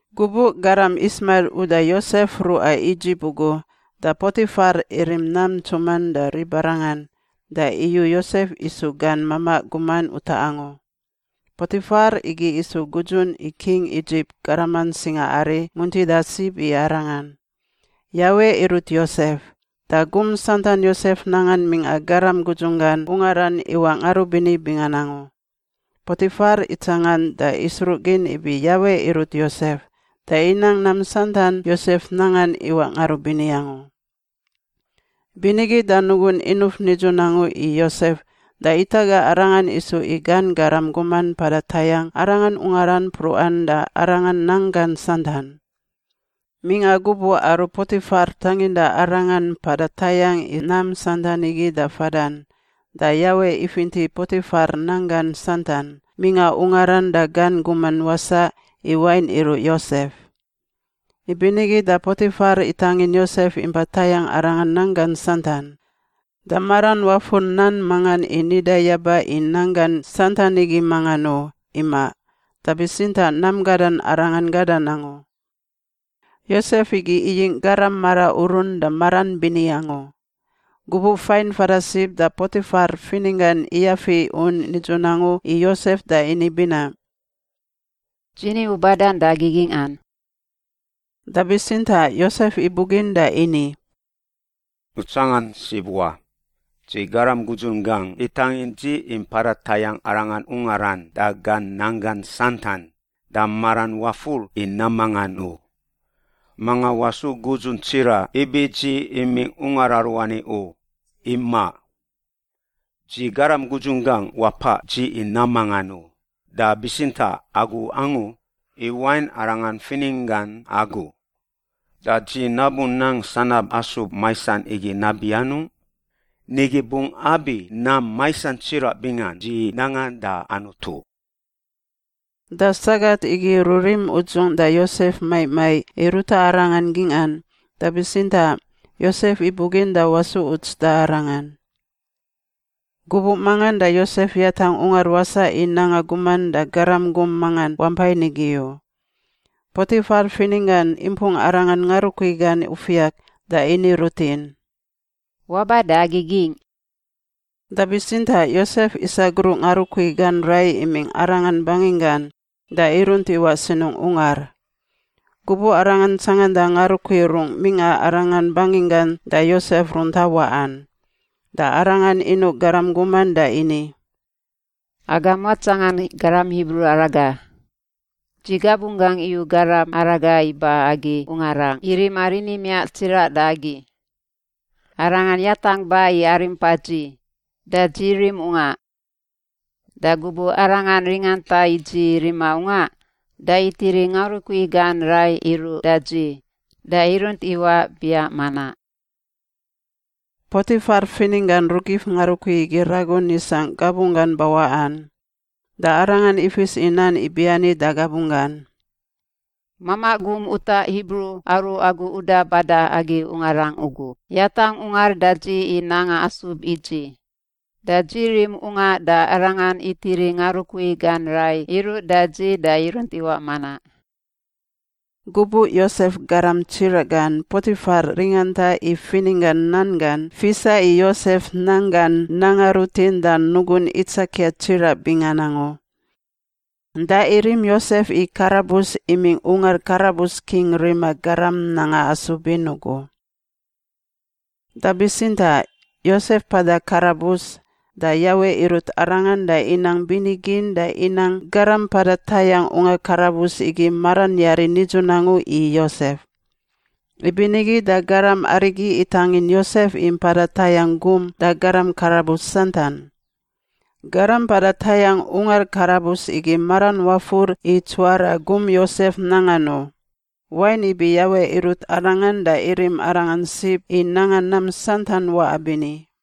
Gubuꞌ garam Ismail uda Yosef ruꞌa Idzip ugu da Potifar irim nam ntsuman da ribarangan da iyu Yosef isu gan mamaꞌ guman utaꞌ angu. Potifar igi isu gudzun i king Idzip garaman singaari muntida sib i arangan. Yawe irut Yosef, da gum santan Yosef nangan mingꞌa garam gudzunggan ungaran iwaꞌ ngarubini bingan angu. Potifar itsangan da isruꞌgin ibi Yawe irut Yosef da inang nam santan Yosef nangan iwaꞌ ngarubini angu, ibinigi da nugun inuf nidzun angu i Yosef da itaga arangan isu i gan garam guman mpada tayangꞌ arangan ungaran mpruꞌan da arangan nanggan santan. Mingꞌa gubuꞌ aru Potifar tanginda arangan mpada tayangꞌ i nam santan igi da fadan, da Yawe ifinti Potifar nanggan santan, mingꞌa ungaran da gan guman wasaꞌ, i wain iruꞌ Yosef. Ibinigi da Potifar itangin Yosef impa tayangꞌ arangan nanggan santan. Da maran wafur nan mangan i nida yaba i nanggan santan igi mangan u, imaꞌ, da bitsintaꞌ nam gadan arangan gadan angu. Yosef igi iyingꞌ garam mara urun da maran bini angu. Gubuꞌ fain fada sib da Potifar fininggan iyafi un nidzun angu i Yosef da ini binaꞌ, “Dzi ni u badan da agi gingꞌan.” Da bitsintaꞌ Yosef ibugin da ini, “U tsangan sib wa! Dzi garam gudzunggangꞌ itangin dzi i mpada tayangꞌ arangan ungaran da gan nanggan santan, da maran wafur i nam mangan u. Manga wasu gudzun tsiraꞌ ibi dzi imingꞌ ungar aruani u, imaꞌ. Dzi garam gudzunggangꞌ wapaꞌ dzi i nam mangan u, da bitsintaꞌ agu angu, i wain arangan fininggan agu. Da dzi nabu nang sanab asub maisan igi nabi anungꞌ? Nigi bungꞌ abi nam maisan tsiraꞌ bingan dzi nangan da Anutu.” Da sagat igi rurim udzung da Yosef maiꞌ maiꞌ i ruta arangan gingꞌan, da bitsintaꞌ Yosef ibugin da wasu uts da arangan. Gubuꞌ mangan da Yosef yatangꞌ ungar wasaꞌ i nanga guman da garam gum mangan wampai nigi u. Potifar fininggan impung arangan ngarukui gan ufiak da ini rutin, “Waba da agi gingꞌ!” Da bitsintaꞌ Yosef isagruꞌ ngarukui gan rai imingꞌ arangan banginggan da irunt iwaꞌ sinungꞌ ungar. Gubuꞌ arangan tsanganda ngarukui rungꞌ mingꞌa arangan banginggan da Yosef runta waꞌan, da arangan inuꞌ garam guman da ini, “Agam watsangan garam Hibru araga. Dzi gabunggangꞌ iyu garam araga iba agi ungarangꞌ i rima rini miaꞌ tsiraꞌ da agi. Arangan yatangꞌ ba i arimpa dzi, da dzi rim ungaꞌ. Da gubuꞌ arangan ringanta i dzi rima ungaꞌ, da itiri ngarukui gan rai iruꞌ da dzi, da irunt iwaꞌ biaꞌ manaꞌ.” Potifar fininggan rugif ngarukui igi ragun isangꞌ gabunggan bawaꞌan. Da arangan ifis i nan ibiani da gabunggan, “Mamaꞌ gum utaꞌ Hibru aru agu uda bada agi ungarangꞌ ugu yatangꞌ ungar da dzi i nanga asub i dzi. Da dzi rim ungaꞌ da arangan itiri ngarukui gan rai iruꞌ da dzi da irunt iwaꞌ manaꞌ.” Gubuꞌ Yosef garam tsiraꞌ gan Potifar ringanta i fininggan nan gan fisa i Yosef nanggan nanga rutin da nugun itsakia tsiraꞌ bingan angu. Da irim Yosef i karabus imingꞌ ungar karabus king rima garam nanga asub in ugu. Da bitsintaꞌ Yosef mpada karabus, da Yawe irut arangan da inang bini gin da inang garam mpada tayangꞌ ungar karabus igi maran yari nidzun angu i Yosef. Ibinigi da garam arigi itangin Yosef i mpada tayangꞌ gum da garam karabus santan. Garam mpada tayangꞌ ungar karabus igi maran wafur i tsuwara gum Yosef nangan u, wain ibi Yawe irut arangan da irim arangan sib i nanga nam santan waꞌa bini.